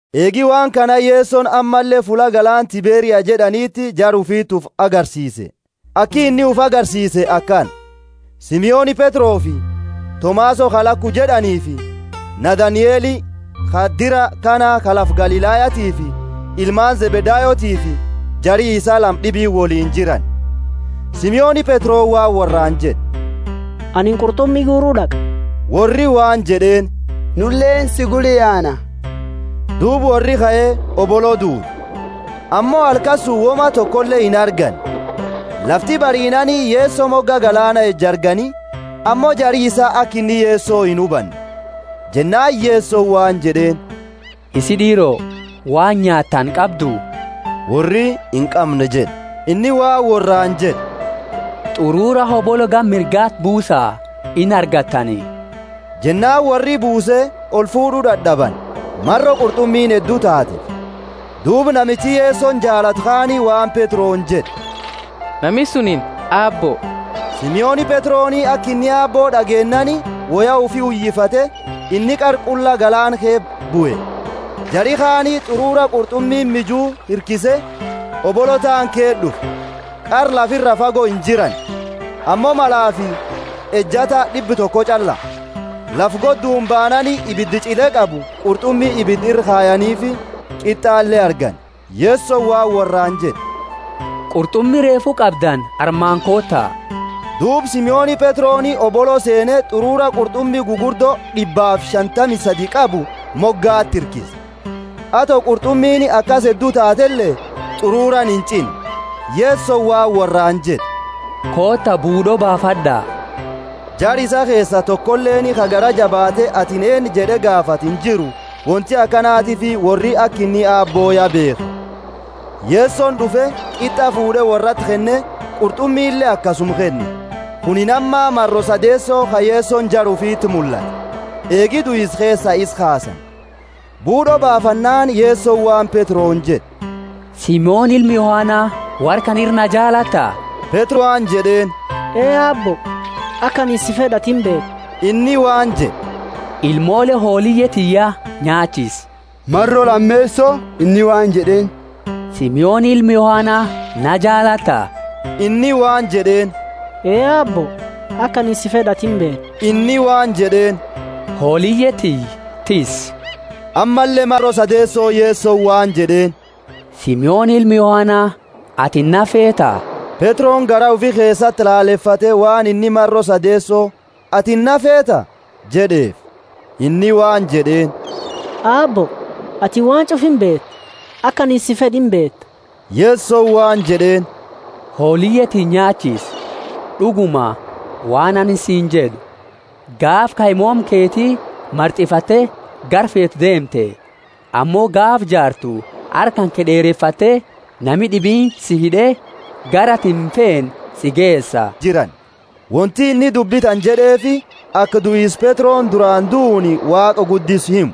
Eegi waan kana Yesoni ammalle fulla galaana Tiberia jed'aniiniti jara ufiti ufi agarsiise. Aki inni ufi agarsiise akana. Simoni Petrofi Tomaso ka Laku jed'aniifi Nathanieli ka dira Kana ka lafa Galilayatiifi, ilmaani Zebedayotiifi jari isaa lama d'ibiini woliini jirani. Simoni Petroni waan worraani jed'e, Anini qurt'umi guuru d'aqa. Worri waan jed'eeni, Nuleeni si gula yaana. Duuba worri kae, hobolo duude: ammo halkani suni woma tokole inarganne. Lafti bariinaani, Yeso moga galaana eju argani, ammo jari isaa aka inni Yeso inhubanne. Jennaani Yesoni waan jed'eeni, Isii d'iiro, waan nyaatani qabdu? Worri, Inqamnu jed'e. Inni waan worraani jed'e, T'urura hobolo gama mirgati buusa, inargattani. Jennaani worri buuse, olfuud'u dad'abani, maro qurt'umiini heddu taateefi. Duuba namichi Yesoni jaalatu kaani waan Petroni jed'e, Nami sunini Aabbo! Simoni Petroni aka inni Aabbo d'ageennaani, woya ufi uyifate inni qara qulla galaana ke bue. Jari kaani t'urura qurt'umi miju hirkise, hobolo taani ke d'ufe. Qara lafa ira fago injirani, ammo malaafi ejata d'ibba toko ch'alla. Lafa godduni baanani ibida ch'ile qabu, qurt'umi ibida ira kayanifi, qit'ale argani. Yesoni waan worraani jed'e, Qurt'umi reefu qabdani armaani koota. Duuba Simoni Petroni hobolo seene t'ururu qurt'umi gugurdo d'ibbaafi shantami sadi qabu mogati hirkise, ato qurt'umiini akasi heddu taatele t'ururaani inch'inne. Yesoni waan worraani jed'e, Koota buud'o baafad'a. Jara isaa keesa tokoleeni ka garaa jabaate, atini eennu jed'e gaafate injiru wonti akanatiifi worri aka inni Aabbo ya beekhe. Yesoni d'ufe, qit'a fuud'e worraati kenne; qurt'umile akasuma kenne. Kunini amma maro sadeeso ka Yesoni jara ufiti mullate, eegi duisa keesaa isa kaasani. Buud'o baafannaani, Yesoni waan Petroni jed'e, Simoni ilma Yohana, worra kana ira naa jaalatta? Petroni waan jed'eeni, Ee Aabbo, aka anini si fed'u atini imbeeta. Inni waan jed'e, Ilmoole hooliye tiyya nyaachisi. Maro lameeso inni waan jed'eeni, Simoni ilma Yohana, naa jaalatta? Inni waan jed'eeni, Ee Aabbo, aka anini si fed'u atini imbeeta. Inni waan jed'eeni, Hooliye tiyya tissi. Ammalle maro sadeeso Yesoni waan jed'eeni, Simoni ilma Yohana, Atini naa feeta? Petroni garaa ufi keesati lalefate waan inni maro sadeeso, Atini naa feeta? jed'eefi. Inni waan jed'eeni, Aabbo, atini waan ch'ufa imbeeta, aka anini si fed'u imbeeta. Yesoni waan jed'eeni, Hooliye tiyya nyaachisi. D'uguma, waan anini siini jed'u, Gaafa kaimooma keti mart'ifatte gara feetu deemte; ammo gaafa jaartu harka kanke d'eerefatte, nami d'ibiini si hid'e gara atini imfeene si geesa jed'e. (Wonti inni dubbi tana jed'eefi, aka duisa Petroni durana duuni Waaqa guddisu himu.)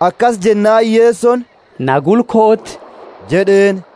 Akasi jennaani Yesoni, Na gula kooti jed'eeni.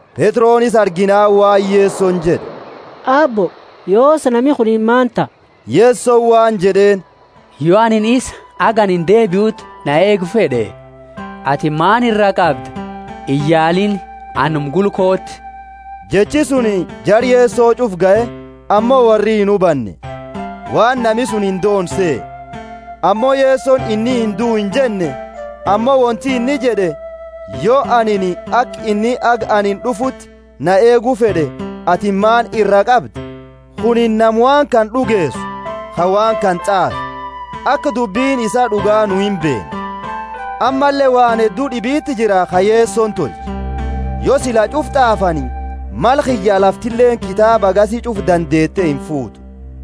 Petroni isa arginaani waan Yesoni jed'e, Aabbo, yoosi, nami kunini maani taha? Yesoni waan jed'eeni yo anini isa haga anini deebiuti na eegu fed'e, atini maani iraa qabda? Iyaaliini anuma gula kooti. Jechi sunini jara Yeso ch'ufa gahe, ammo worri inhubanne, waan nami suni indoone sehe. Ammo Yesoni inni induu injenne, ammo wonti inni jed'e yo anini aka inni haga anini d'ufuti na eegu fed'e atini maani iraa qabda? Kunini nama waawaawaan kana d'ugeesu, ka waan kana t'aafe; aka dubbini isaa d'uga nu imbeenna. Ammalle waan heddu d'ibiti jira ka Yesoni tolche. Yo sila ch'ufa t'aafani, mala kiyya, laftileeni kitaaba hagasi ch'ufa dandeete imfuutu.